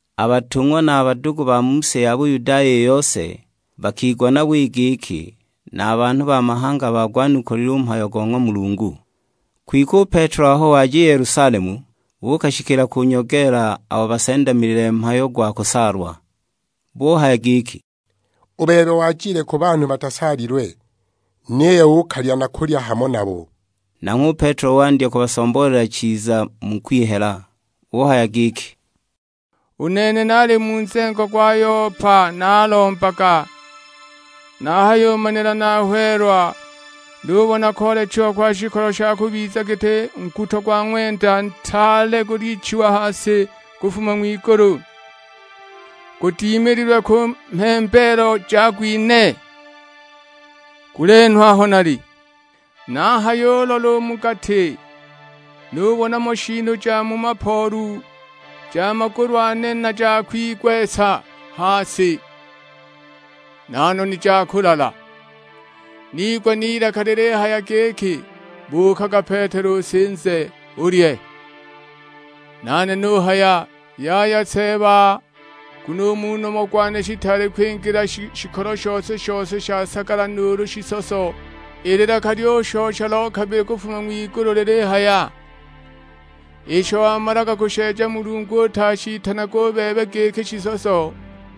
A batung'wa na a badugu ba mu si ya Buyudaya i yose, bakigwa nabo i giki na a banhu ba mahanga bagwanukulile u mhayo go ng'wa Mulungu. Kwike u Petelo aho waja i Yelusalemu, buukashikila kunyogeela abo basendamilile mhayo gwa kusaalwa. Buhaya giki, "U bebe wajile ku banhu batasaalilwe, niyo uukalya na kulya hamo nabo!" Nanghwe u Petelo wandya kubasomboolela chiza mu kwihela, uhaya giki, "U nene naali mu nzengo gwa Yopa naalombaga, nahayimanila nahweelwa, nubona koolechiwa kwa shikolo sha kubiza giti nguto gwa ng'wenda ntaale gulichiwa ha si kufuma ng'wigulu, gudimililwe ku mhembeelo jago ine, gulenhwa aho nali. Nahayulola u mu gati, nubona mo shiinu ja mu mapoolu: ja magulu ane na ja kwigwesa ha si, na noni ja kulala. Niigwa n'ilaka lilihaya giki, 'Buukaga Petelo usinze, ulye.' Nane nuhaya, 'Yaya Seeba, nguno u mu nomo gwane shitaali kwingila shikolo shose-shose sha sagala nuulu shisoso!' I lilaka lyushosha lo kabili kufuma ng'wigulu lilihaya, 'Isho wamalaga kusheeja Mulungu utashitanage u bebe giki shisoso.'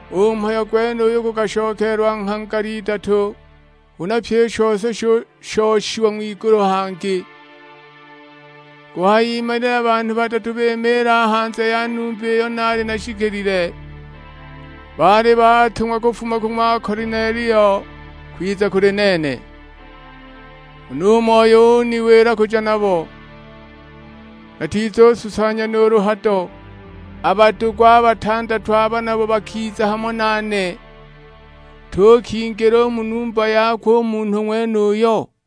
U mhayo gwenuyo gukashokeelwa nghangala idatu, huna pyi i shose shushoshiwa ng'wigulu hangi. Kuhayimanila banhu badatu bimiila a hanze ya numba iyo naali nashikilile; baali baatung'wa kufuma ku ng'wa Kolinelio, kwiza kuli nene. Huna u Moyo uniwila kuja nabo, natizususanya nuulu hado. A badugu a batandatu aba nabo bakiza hamo nane, tuukingila u mu numba yakwe u munhu ng'wenuyo.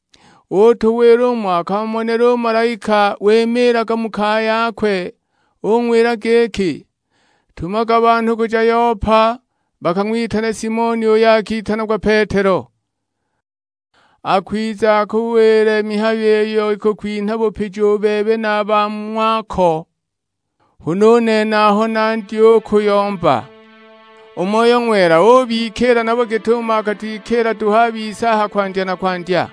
Utuwila umo akamonela u malaika wimiilaga mu kaya yakwe; ung'wila giki, 'Tumaga banhu kuja Yopa bakang'witane Simoni uyo akitanagwa Petelo. Akwiza akuwile mihayo iyo ikukwinha bupiji u bebe na a ba mu ng'wako.' Huna u nene aho nandya u kuyomba, u Moyo Ng'wela ubikiila nabo git'umo akatwikiila duhu a bise a ha kwandya na kwandya.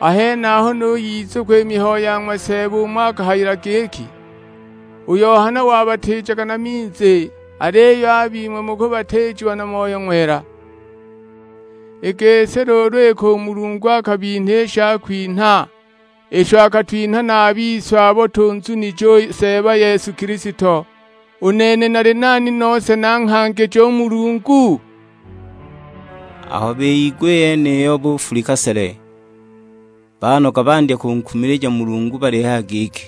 A henaho nuyizukwa i mihayo ya ng'wa Seeba umo akahayila giki, 'U Yohana wabatiijaga na minzi, aliyo a bing'we mukubatiijiwa na Moyo Ng'wela.' I gisi luulu iki u Mulungu akabinha i shakwinha isho akatwinha na a bise abo tunzunije u Seeba Yesu Kilisto, u nene nali nani nose nanghangije u Mulungu?" Aho biyigwa i yeniyo bufulika sele; banoga bandya kunkumilija Mulungu balihaya giki,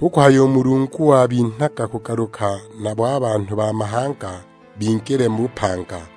"Hu kuhaya u Mulungu wabinhaga kugaluka nabo a banhu ba mahanga, bingile mu bupanga."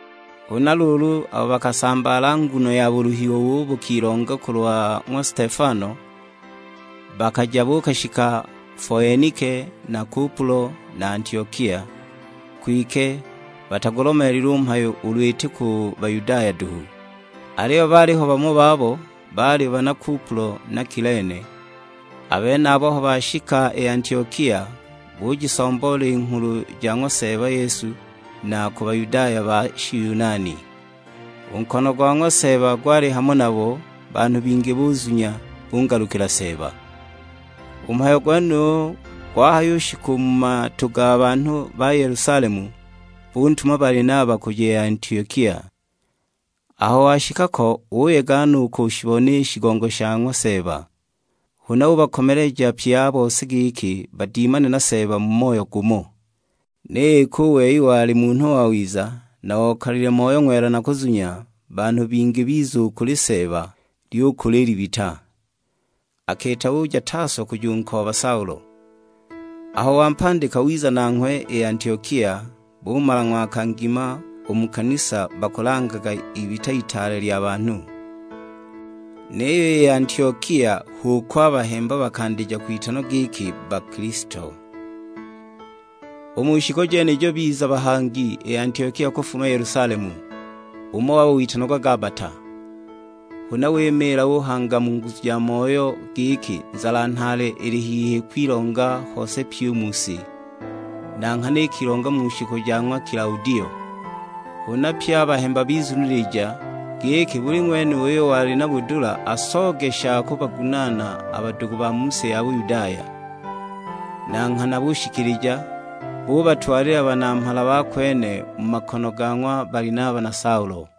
Huna luulu, abo bakasambaala nguno ya buluhiwa ubo bukilonga kulwa ng'wa Stefano, bakaja buukashika Foenike na Kupulo na Antiokia; kwike batagulomeelile u mhayo ulu iti ku Bayudaya duhu. Aliyo baaliho bamo babo, baali bana Kupulo na Kilene; a benabo aho bashika i Antiokia, bujisomboola i nghulu ja ng'wa Seeba Yesu na ku Bayudaya ba Shiyunani. U nkono go ng'wa Seeba gwali hamo nabo, banhu bingi buzunya, bungalukila Seeba. U mhayo gwenuyo gwahayushika u mu matu ga banhu ba Yelusalemu, buntuma Balinaba kuja i Antiokia. Aho washika ko uyega no u kushibona i shigongo sha ng'wa Seeba. Huna ubakomeleja pye a bose giki badimane na Seeba mu moyo gumo. Niyo iki u wei wali munhu wawiza, na okalile Moyo Ng'wela na kuzunya, banhu bingi biza u kuli Seeba; lyukula i libita. Akiita uja Taso kujunkooba Saulo. Aho wampandika wiza nanghwe i Antiokia; bumala ng'waka ngima u mu kanisa bakulangaga ibita itaale lya banhu. Niyo i Antiokia h'uko a bahemba bakandija kwitanwa giki Bakilisto. U mu shiku jenijo biza bahangi i Antiokia kufuma Yelusalemu. Umo wabo, witanagwa Gabata, huna wimiila uhanga mu nguzu ja ng'wa Moyo giki nzala nhaale ili hihi kwilonga hose pyi u mu si; (na nghana ikilonga mu shiku ja ng'wa Kilaudio). Huna pye a bahemba bizunilija, giki buli ng'wene uyo wali na budula asooge sha kubagunaana a badugu ba mu si ya Buyudaya. Na nghana bushikilija, bubatwalila banamhala ba kwene mu makono ga ng'wa Balinaba na Saulo.